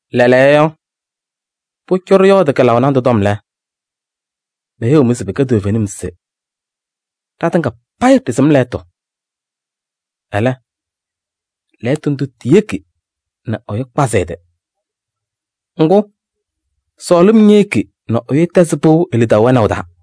Lɛɛlɛɛyɔ, pʋcɔ ɖɩyɔɔdɩ kɩlaʋ nandʋ tɔm lɛ, meheyiɣ-mɩ se pɩkɛ toovenim se: “Ɖatɩŋa payɩ ɖɩsɩm lɛɣtʋ.” Ɛlɛ, lɛɣtʋ ndʋ tiyeki nɛ ɛyʋ kpazɩ ɛ-tɩ. Ŋgʋ, sɔɔlɩm ñeyeki nɛ ɛyʋ tɛzɩ pɩʋ e-lidaʋ wɛnaʋ taa.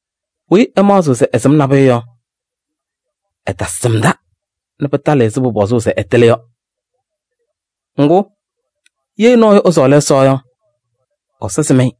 Weyi ɛmaɣzɩɣ se ɛsɩm nabʋyʋ yɔ, ɛtasɩmda nɛ pɩtalɩ ɛzɩ pʋpɔzʋʋ se ɛtɩlɩ yɔ. Ŋgʋ, ye nɔɔyʋ ɛsɔɔlɩ Ɛsɔ yɔ, Ɛsɔ sɩm-ɩ.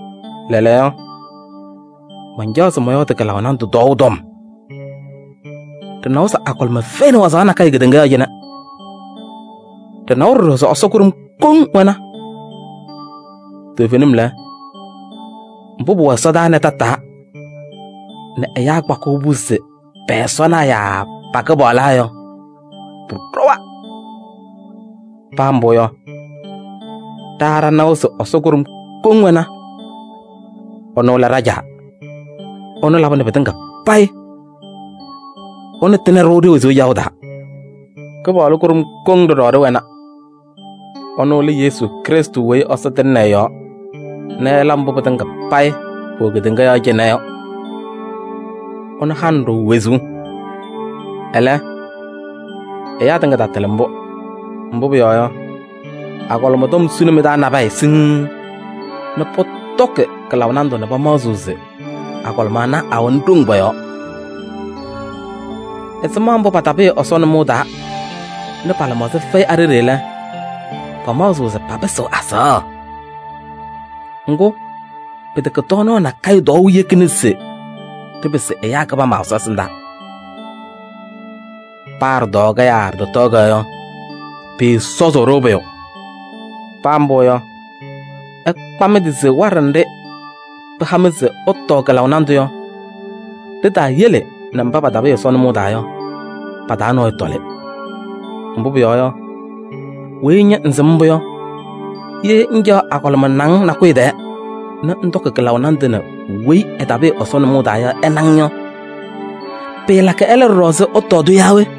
Lɛɛlɛɛyɔ, mancaɣ se mɔyɔɔdɩ kɩlaʋ nandʋ tɔɔʋ tɔm. Ɖɩnawa se agɔlɩma fɛyɩnɩ wazaɣ nakɛyɛ kedeŋa yɔɔ cɩnɛ. Ɖɩnawa ɖɔɖɔ se Ɛsɔ kʋɖʋm koŋ wɛna. Toovenim lɛ, mbʋ pʋwɛ ɛsɔdaa nɛ tataa nɛ ɛyaa kpakɩɣ-pʋ se pɛ-ɛsɔnaa yaa pa-kɩpaɣlaa yɔ, pʋɖɔwa. Paa mbʋ yɔ, ɖa ɖanawa se Ɛsɔ kʋɖʋm koŋ wɛna. Ɛnʋ lɛ ɖa-Caa. Ɛnʋ labɩnɩ pɩtɩŋa payɩ, ɛnʋ tɩnɩ-ɖʋ ɖe-wezuu caɣʋ taa. Kɩpaɣlʋ kʋɖʋm koŋ ɖɔɖɔ ɖɩwɛna. Ɛnʋ lɛ Yesu Krɩstʋ weyi Ɛsɔ tɩŋnɩ ɛ-yɔɔ nɛ ɛla mbʋ pɩtɩŋa payɩ pʋwɛ kedeŋa yɔɔ cɩnɛ yɔ. Ɛnʋ hanɩ-ɖʋ wezuu. Ɛlɛ, ɛyaa tɩŋa tatɩlɩ mbʋ. Mbʋ pʋyɔɔ yɔ, agɔlɩma tɔm sʋnɩ mɩ-taa nabɛyɛ siŋŋ nɛ pɔtɔkɩ kɩlaʋ nandʋ nɛ pamaɣzɩɣ se agɔlɩma ana awɛnɩ ɖoŋ pɔ-yɔɔ. Ɛzɩma mbʋ patapɩɩ Ɛsɔ nʋmɔʋ taa nɛ pa-lɩmaɣza fɛyɩ a-ɖeɖe lɛ, pamaɣzɩɣ se papɩsɩɣ azaɣa. Ŋgʋ, pɩtɛkɛ tɔɔnaɣ nakɛyɛ tɔɔʋ yekina nɛ ɖɩpɩsɩ ɛyaa kɩbama Ɛsɔ ɛsɩndaa. Paa ɖɩtɔɔ-kɛ yaa ɖɩtɔtɔɔ-kɛ yɔ, pɩɩsɔzʋʋ-ɖʋ pʋyʋ. Paa mbʋ yɔ, ɩkpa mɩ-tɩ se waɖɛ nɖɩ pɩha-mɩ se ɩtɔɔ kɩlaʋ nandʋ yɔ, ɖitaayele nɛ mba patapɩɩ Ɛsɔ nʋmɔʋ taa yɔ, pa-taa nɔɔyʋ tɔlɩ. Mbʋ pʋyɔɔ yɔ, weyi ña ŋsɩm mbʋ yɔ, ye ŋcaɣ agɔlɩma naŋ nakʋyʋ tɛɛ nɛ ŋtɔkɩ kɩlaʋ nandʋ nɛ weyi ɛtapɩɩ Ɛsɔ nʋmɔʋ taa yɔ ɛna-ŋ yɔ, pɩɩlakɩ ɛlɛ ɖɔɖɔ se ɛtɔɔ-tʋ yaa we?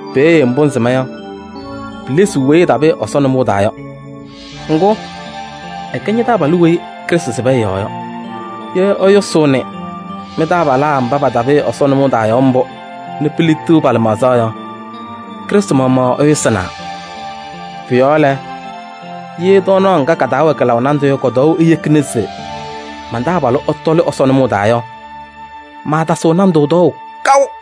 Peeye mbʋ ŋsɩma yɔ, pilesiɣ weyi ɛtapɩɩ Ɛsɔ nʋmɔʋ taa yɔ. Ŋgʋ, ɛkɛ ña-taabalʋ weyi Krɩstʋ sɩbɩ ɛ-yɔɔ yɔ. Ye ɩyʋsʋʋnɩ mɩ-taabalaa mba patapɩɩ Ɛsɔ nʋmɔʋ taa yɔ mbʋ nɛ piliɣtiɣ pa-lɩmaɣza yɔ, Krɩstʋ maɣmaɣ ɩyʋsɩnaa. Pʋ-yɔɔ lɛ, ye tɔɔnaɣ ŋga ka-taa wɛ kɩlaʋ nandʋ yɔ kɔ-tɔɔʋ eyekina se man-taabalʋ ɛtɔlɩ Ɛsɔ nʋmɔʋ taa yɔ, maatasɩɣ nandʋ tɔɔʋ kaʋ.